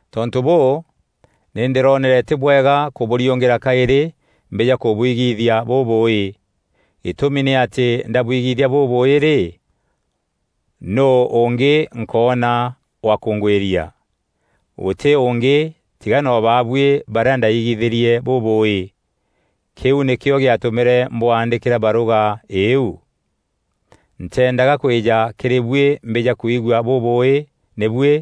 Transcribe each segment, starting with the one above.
Tontû bûû, nî ndîroonere tî bwega kûbûriûngîra kaîrî mbîja kûbwigithia bûbûûî. Gîtûmi nî atî ndabwigithia bûbûûî rî, nûû ûngî nkoona wa kûngwîria? Gûtî ûngî tiga no baabuî barîa ndaigithîrie bûbûûî. Kîu nîkîo gîatûmîre mbwaandîkîra barûga îîu. Nteendaga kwîja kîrî buî mbîja kwigua bûbûûî nî buî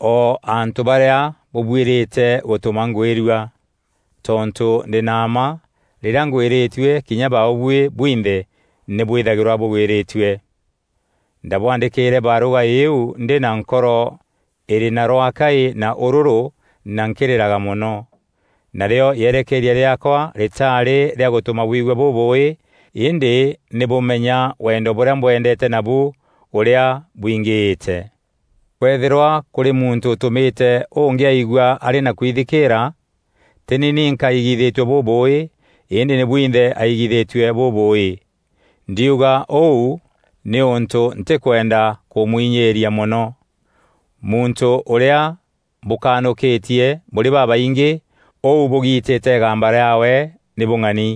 o antû barîa bûbuîrîte gûtûma ngwîrua. Tontû ndî na mma rîrîa ngwîrîtue kinya baabuî bwinthe nî bwîthagîrwa bûgwîrîtue. Ndabwaandîkîîre barûga îîu ndî na nkoro îrî na rwaakaî na ûrûrû na nkîrîraga mono. Narîo yerekeeria rîaakwa rîtaarî rîa gûtûma bwigua bûbûûî îndî nî bûmenya wendo bûrîa mbwendeete nabu ûrîa bwingîîte. Kwethîrwa kûrî muntû ûtûmîte ûngî aigua arî na kwithikîîra, tî ni ninka aigithîtie bûbûûî îndî nî bwinthe aigithîtie bûbûûî. Ndiuga ûu nîûntû ntîkwenda kûmwinyîîria mono. Muntû ûrîa bûkanûkîtie bûrî babaingî, ûu bûgitîte îgamba rîaawe nî bûng'ani.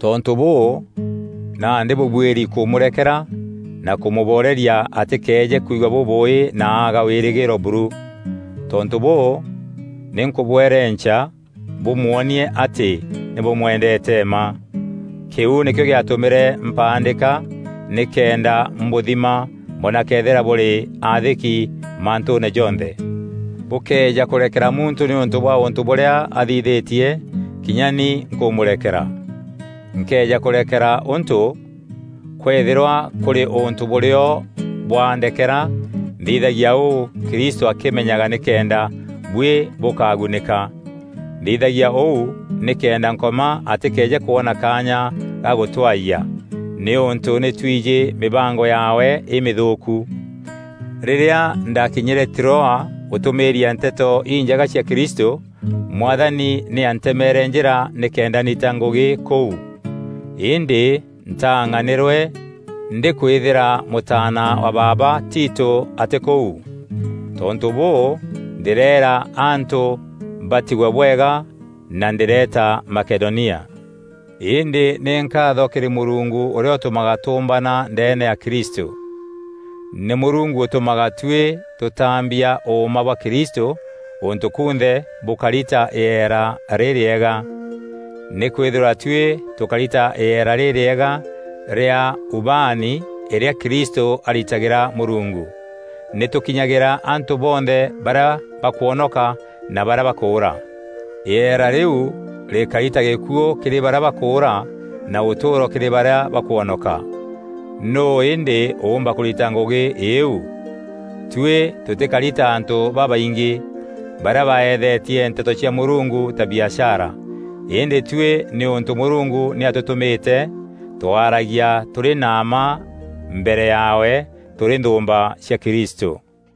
Tontû bûû, nandî bûbuîri kûmûrekera na kûmûboreria atîkëeje kwigua bûbûûî na aaga wîrîgîîro buru. Tontû bûû, nî nkûbwerenca bûmwonie atî nî bûmwendeete mma. Kîu nîkîo gîatûmîre mpaandîka nîkenda mbûthima mbona këethîra bûrî aathîki mantûûne jonthe. Bûkëeja kûrekera muntû nîûntû bwa ûntû bûrîa athithîtie, kinya ni nkûmûrekera. Nkëeja kûrekera ûntû, kwëethîrwa kûrî ûntû bûrîo bwa ndekera, nthithagia ûu Kristû akîmenyaga nîkenda buî bûkagunîka. Nthithagia ûu nîkenda Nkoma atîkeeje kwona kaanya ga gûtwaayia, nîûntû nî twijî mîbango yaawe îmîthûûku. Rîrîa ndakinyîre Troa gûtûmîîria Nteto Injega cia Kristû, Mwathani nî antemeere njîra nîkenda ndita ngûgî kûu. Îndî ntaang'anîrwe ndîkwîthîra mûtaana wa baaba Tito atî kûu. Tontû bûû, ndîreera antû batigwe bwega na ndîreeta Makedonia. Îndî nî nkaatho kîrî Mûrungu ûrîa ûtûmaga tûûmbana ndeene ya Kristû. Nî Mûrungu ûtûmaga tuî tûtaambia ûûma bwa Kristû gûntû kunthe bûkari ta îera rîrîega. Nîkwîthîrwa tuî tûkari ta îera rîrîega rîa ubaani îrîa Kristû aritagîra Mûrungu, nî tûkinyagîra antû bonthe barîa bakwonoka na barîa bakûûra. Îera rîu rîkari ta gîkuû kîrî barîa bakûûra na ûtûûro kîrî barîa bakwonoka. Nûû îndî ûûmba kûrita ngûgî îîu? Tuî tûtîkari ta antû babaingî, barîa baethetie Nteto cia Mûrungu ta biashara. Îndî tuî nîûntû Mûrungu nî atûtûmîte, twaaragia tûrî na mma mbere yaawe, tûrî nthûûmba cia Kristû.